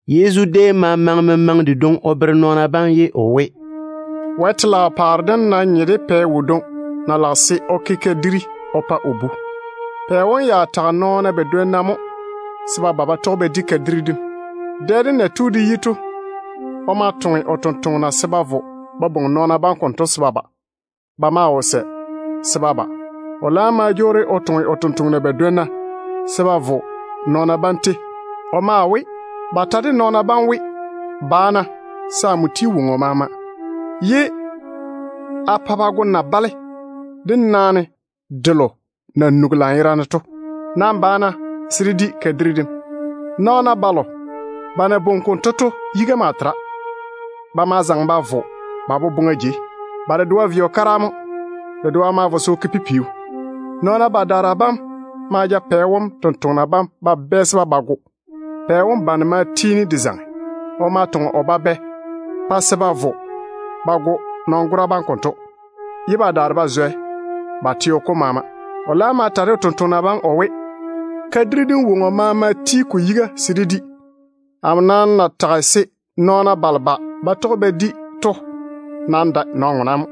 Yezu déem ma maŋe memaŋe dedwoŋi o bere nɔɔna bam ye o we, “Wɛ telaao paare dem nam nye de pɛ wodwoŋi na lage se o ke kadiri o pa o bu. Pɛ wom ya tage nɔɔna badwonna mo se ba ba ba tɔge ba di kadiri dem. Dɛ dem na tu de yi to, o ma toŋe o tontoŋena se ba vo ba bwoŋi nɔɔna bam konto se ba ba. Ba maa wo sɛ se ba ba. O laam ma jwoori o toŋe o tontoŋena badwonna se ba vo nɔɔna bam tei. O maa we ba ta de nɔɔna bam we, ‘Ba-na, se amo ti woŋo maama yiga, ye a pa ba go na-bale de naane delo na nugi lanyerane to. Nam ba-na se dé di kadiri dem wodiu kom.’ Nɔɔna balo ba na bwoŋi konto to yiga maa tera. Ba ma zaŋe ba vo ba boboŋa jei. Ba dedoa vei o kara mo. Dedoa ma vo se o ke o pipiu. Nɔɔna badaara bam ma ja pɛ wom tontoŋena bam ba bɛɛse ba go. Pɛ wom bane ma tiini de zaŋe. O ma toŋe o babɛ pa se ba vo ba go nɔn-gora bam konto ye ba daare ba zwɛ ba teo kom maama. O laam ma ta de o tontoŋena bam o we, ‘Kadiri dem woŋo maama ti ko yiga se dé di. Amo nam na tage se nɔɔna balo ba ba tɔge ba di to ya wo maŋe de kuri dem.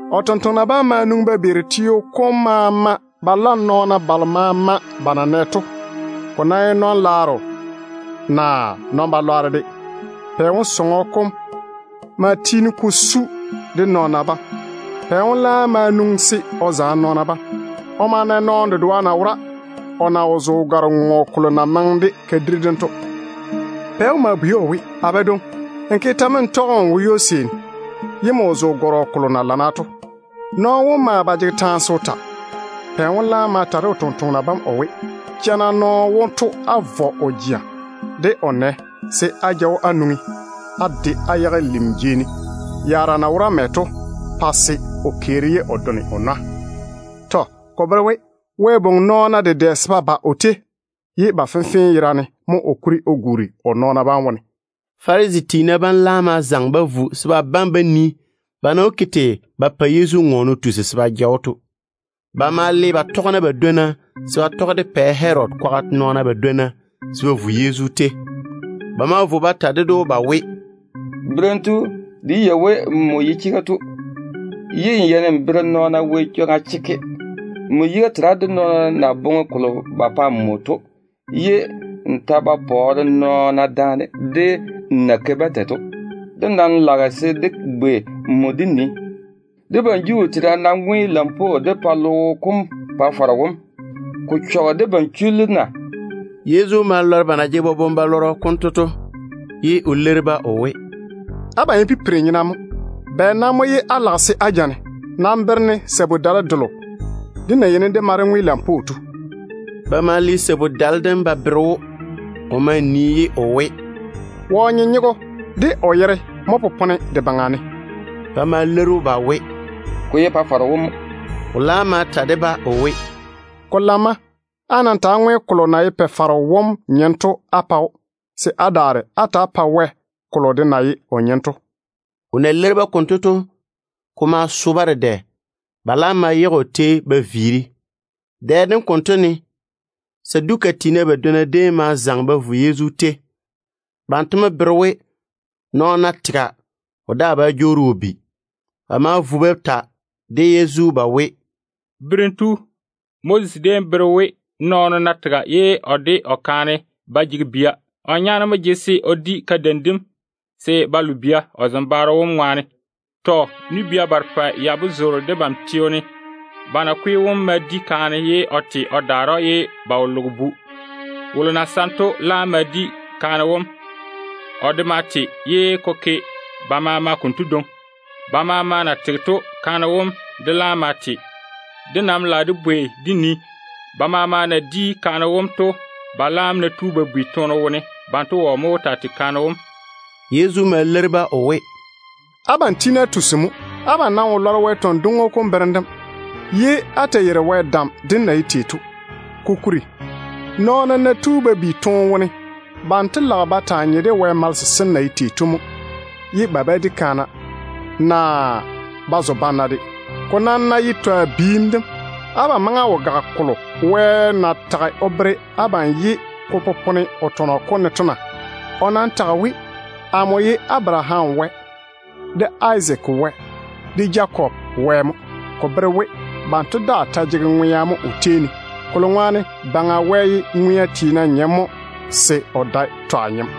O tontoŋena bam ma nwoŋi ba beeri teo kom maama ba la nɔɔna balo maama ba na nɛ to, ko ná ye nɔn-laaro naa nɔn-balwaaro de. Pɛ wom sɔŋɔ kom ma tiini ko su de nɔɔna bam. Pɛ wom laam ma nwoŋi se o zaane nɔɔna bam. O ma na nɔɔno dedoa na wora o na wo zo gare-ŋoŋo kolo na maŋe de kadiri dim to. Pɛ wom ma bwei‑o o we, ‘A badwoŋi, nmo ke tɛ mo n tɔge n wo ywo-seeni, ye nmo wo zo gɔrɔ kolo na lamma to?’ Nɔɔno wom maa ba jege taane se o ta. Pɛ wom laam ma ta de o tontoŋena o we, ‘Ja-na nɔɔno wonto á vɔ o jea de o nɛ, se á ja‑o á nwoŋi á de á yage lim jei ne, yaara na wo mɛ to, pa se o keeri ye o done o nwa.’ Tɔ. Ko bere we, Wɛ bwoŋi nɔɔna dedɛ se ba ba o tei, ye ba fenfee yerane mo o kuri o guuri o nɔɔna bam wone.” Farisi tiina bam laam ma zaŋe ba vo se ba bane ba nii ba na wó ke tei ba pa Yezu ŋɔɔne o tusi se ba ja‑o to. Ba ma le ba tɔgena badwonna se ba tɔge de Pɛ Herodi kwaga nɔɔna badwonna se ba vo Yezu tei. Ba ma vo ba ta ded‑o ba we, “Berem tu, dé yei we nmo ye chega tu, ye n yeini n bere nɔɔna Wɛ chwoŋa chekke. Nmo yiga tera de nɔɔna na boŋe kolo ba pa nmo to, ye n ta ba pɔɔre nɔɔna daane de n na ke-ba tei to. Dé nam lage se dé bwei nmo dé nii, debam Juu tiina ná ŋwe lampwoo dé pa logo kom Pa-faro wom, ko chɔge debam chullu na?” Yezu ma lɔre ba na jege boboŋ-balɔrɔ konto to, ye o leiri-ba o we, “Abam ye pipiri-nyena mo. Bɛ nam mo ye á lage se á ja-ne? Nam bere-ne sabu-dale delo dé na yeini dé ma ŋwe lampwoo to.” Ba ma le sabu-dale dem ba bere‑o. O ma nii ye o we, “Wɔ nyenyego de o yere mo ba sare ba yage de baŋa ne?” Ba ma leiri‑o ba we, “Ko ye Pa-faro wom mo.” O laam ma ta de-ba o we, “Ko lamma. Á nam ta‑á ŋwe kolo na ye Pa-faro wom nyem to á pa‑o, se á daare á ta‑á pae Wɛ kolo de na ye o nyem to.” O na leiri-ba konto to, ko ma so-ba dedɛ. Ba laam ma yage o tei ye ba viiri. Dɛ dem konto ne, Saduka tiina badwonna déem ma zaŋe ba vo Yezu tei. Banto mo bere we, nɔɔno ná tega, o daa bá jwoori o bi. Ba ma vo ba ta de Yezu ba we, “Berem tu, Moses déem bere we, nɔɔno ná tega ye o de o kaane ba jege bia, o nyaane mo jege se o di kadeim dem se ba lo bia o zembaaro wom ŋwaane. Tɔ. Nu-bia barepɛ ya mo zoore debam teo ne. Ba nakwe wom ma di kaane ye o te o daare‑o ye o wo loge bu. Wolo na saŋe to laam ma di kaane wom. O de ma te, ye ko ke ba maama konto dwoŋi. Ba maama na tege to, kaane wom de laam ma te. Dé nam lage dé bwei dé nii, ba maama na di kaane wom to, ba laam ná tu ba bi toone wone, banto wɔ mo wó taa tei kaane wom?” Yezu ma leiri-ba o we, “Abam tiini á tusi mo. Abam nam wo lɔre Wɛ tɔn-dwoŋo kom berem dem, ye á ta yeiri Wɛ dam dem na ye tei to. Kokuri, nɔɔna ná tu ba bi toone wone, banto lage ba taa nye de Wɛ malese sem na ye tei to mo, ye ba ba di kaana, naa ba zo banna de. Ko nam ná ye twa biim dem, abam maŋe á wo gage kolo Wɛ na tage o bere abam ye ko popone o tɔnɔ kom ne to na? O nam tage we, ‘Amo ye Abaraham Wɛ, de Izaak Wɛ, de Jakob Wɛ mo.’ Ko bere we banto daa ta jege ŋwea mo o tei ne, kolo ŋwaane Baŋa Wɛ ye ŋwea tiina nyem mo se o dae twa nyem.”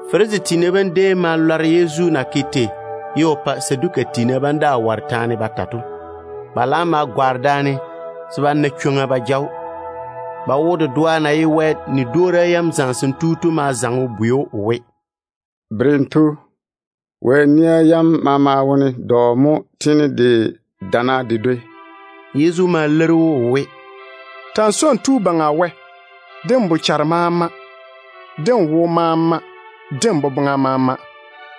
Farisi tiina bam déem ma lɔre Yezu na ke tei ye o pa Saduka tiina bam daa ware taane ba ta to. Ba laam ma gwaane daane se ba na chwoŋa ba ja‑o. Ba wo dedoa na ye Wɛ nia yam zamesem tu to ma zaŋe o bwei‑o o we, “Berem tu, Wɛ nia yam maama wone dɔ mo tiini de dana de dwoi?” Yezu ma leiri‑o o we, “Ta‑n swoi n tu Baŋa Wɛ, de n bochare maama, de n wo maama, de n boboŋa maama.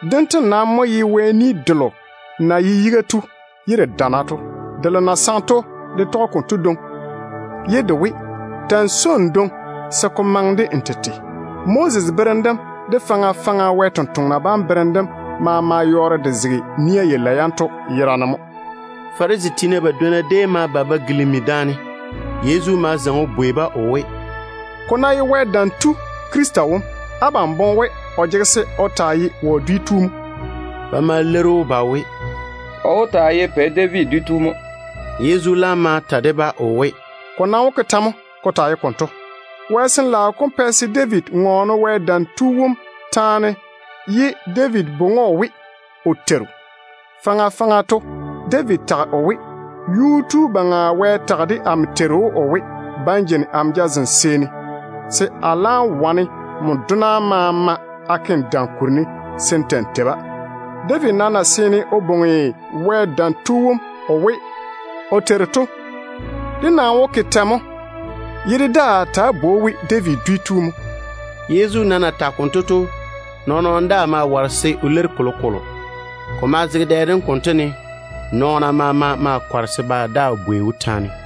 Dento nam mo ye Wɛ ni delo na ye yiga tu ye de dana to. Delo na saŋe to de tɔge konto dwoŋi ye de we: Ta‑n swoi n dwoŋi se ko maŋe de n tete. Moses de faŋa faŋa Wɛ sampwori sem bera yam maama yɔɔre ya zege nia yalei yanto yera ne mo.” Farisi tiina badwonna déem ma ba ba gilimi daane. Yezu ma zaŋe o bwei-ba o we, “Ko ná ye Wɛ Dam Tu Krista wom, abam boŋe we o jege se o nwoŋi wɔ dwi wone mo?” Ba ma leiri‑o ba we, “O wó taa ye Pɛ David dwi tu mo.” Yezu laam ma ta de-ba o we, “Ko nam wó ke tɛ mo ko taa ye konto? Wɛ Sin-laao kom pɛ se David ŋɔɔne Wɛ Dam Tu wom taane ye David bwoŋi‑o we, o Teiru. Faŋa faŋa to David tage o we: ‘Yuu-tu Baŋa Wɛ tage de amo Teiru wom o we, Ba n jeini amo jazem seeni se a laam wane n dona bam a ke nmo dam kuri ne se n ta‑n tei-ba.’ David nam na seene o bwoŋi Wɛ Dam Tu wom o we o Teiru to, dé nam wó ke tɛ mo ye dé daa ta bwoi‑o we David dwi tu mo?” Yezu nam na tage konto to, nɔɔn-nɔɔno daa ma ware se o leiri kolokolo. Ko ma zege dɛ dem konto ne nɔɔna maama kɔre se ba daa bwei‑o taane.